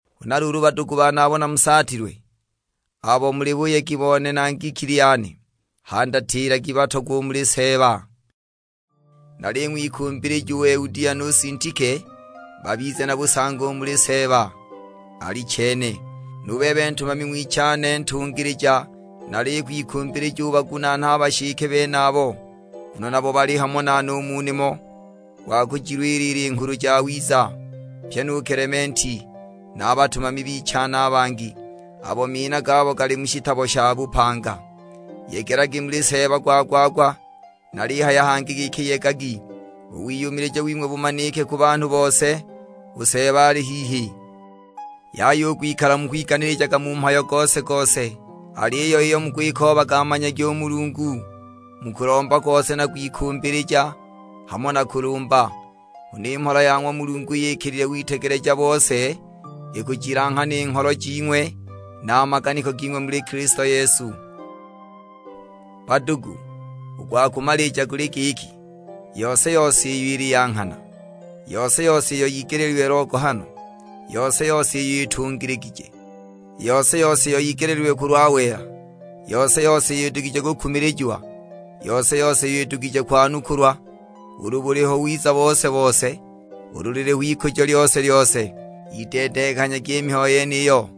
Huna luulu badugu bane abo namusaatilwe, abo muli buyegi bone na ngikili yane, handatilagi batogwa u muli Seeba. Naling'wikumbilija u Eudia nu Sintike babize na busangi u muli Seeba. Alichene, nu bebe ntumami ng'wichane ntungilija nalikwikumbilija ubagunaane a bashike benabo, nguno nabo bali hamo nane u mu nimo gwa kujilwilila i Nghulu Jawiza; pyi nu Kelementi, na a batumami bichane a bangi, abo mina gabo gali mu shitabo sha bupanga. Yegelagi muli Seeba gwa-gwa-gwa; nalihaya hangi giki yegagi. U wiyumilija wing'we bumanike ku banhu bose, u Seeba ali hihi. Yaya u kwikala mukwiganilijaga mu mhayo gose-gose, aliyo iyo mukwikoobaga manyagi u Mulungu mu kulomba kose na kwikumbilija, hamo na kulumba. Huna i mhola ya ng'wa Mulungu iyo ikilile witegeleja bose ikujilanghana i ngholo jing'we na a maganiko ging'we muli Kilisto Yesu. Badugu, u gwa kumalija guli giki, yose-yose iyo ili ya nghana, yose-yose iyo yigeleelilwe logohano, yose-yose iyo itungiligije, yose-yose iyo yigeleelilwe kulwa wela, yose-yose iyo idugije kukumilijiwa, yose-yose iyo idugije kwanukulwa; ulu buliho wiza bose-bose, ulu liliho ikujo lyose-lyose, yideedenghanyagi i mihayo yeniyo.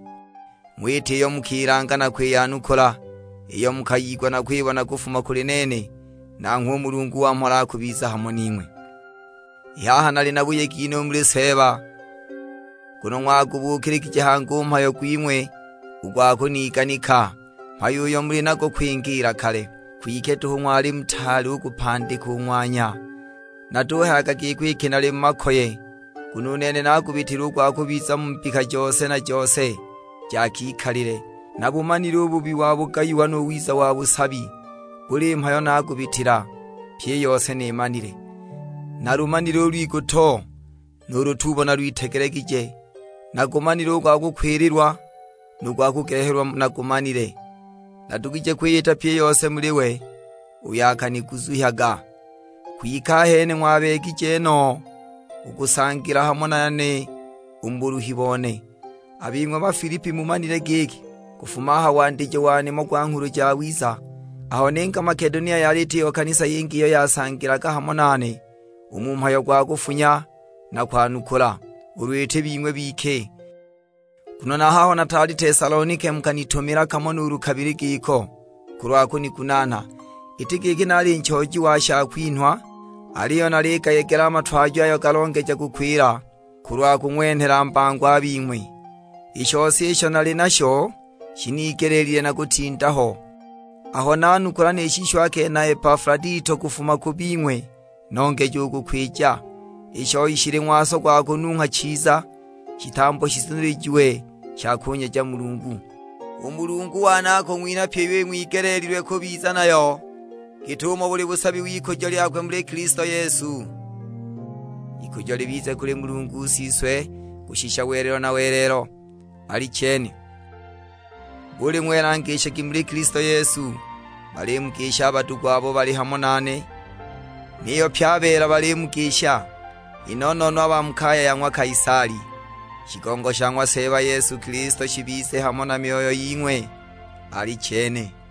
Ng'wita iyo mukilanga na kwiyanukula, iyo mukayigwa na kwibona kufuma kuli nene; nanghwe u Mulungu wa mhola akubiza hamo ning'we. I haha nali na buyegi no u muli Seeba, nguno ng'wagubuukiligije hangi u mhayo gwing'we u gwa kuniganika, mhayo uyo muli nago kwingiila kale; kwike duhu ng'wali mutaali u kupandika u ng'wanya. Natuhayaga giko iki nali mu makoye; nguno u nene naagubitila u gwa kubiza mu mbika jose na jose ja kikalile. Nabumanile u bubi wa bugayiwa nu wiza wa busabi, buli mhayo naagubitila, pyi i yose nimanile; nalumanile u lwiguto, nu lutuubo nalwitegelegije. Nagumanile u gwa kukwililwa, nu gwa kugehelwa nagumanile. Nadugije kwiyita pyi i yose muli we uyo akaniguzuhyaga. Kwike ahene ng'wabeegije no u kusangila hamo nane u mu buluhi bone. A bing'we Bafilipi mumanile giki kufuma a ha wandijo wa nimo gwa Nghulu Jawiza, aho ninga Makedonia yali itiho kanisa yingi iyo yasangilaga hamo nane u mu mhayo gwa kufunya na kwanukula, ulu iti bing'we bike. Nguno na a haho naali Tesalonike mukanitumila kamo nuulu kabili giko, kulwa kunigunaana. Iti giki nali nchooji wa shakwinhwa, aliyo naligayegela a matwajo ayo galongeja kukwila kulwa kung'wenhela mbango a bing'we. I shose isho nali nasho shinigelile na kutinda ho. Aho nanukula ni shisho akenha Epafuladito kufuma ku bing'we nongeja u kukwija; i shoi shili ng'waso gwa kunungha chiza, shitambo shizunilijiwe sha kunyeja Mulungu. U Mulungu wane akung'winha pyi iyo ing'wigeleelilwe kubiza nayo git'umo buli busabi w'ikujo lyakwe muli Kilisto Yesu. Ikujo libize kuli Mulungu Siswe kushisha welelo na welelo: Alichene! Buli ng'wela ngishagi muli Kilisto Yesu. Balimugisha a badugu abo bali hamo nane. Niyo pye a beela balimugisha, i no-no-no a ba mu kaya ya ng'wa Kaisali. Shigongo sha ng'wa Seeba Yesu Kilisto shibize hamo na myoyo ying'we: Alichene.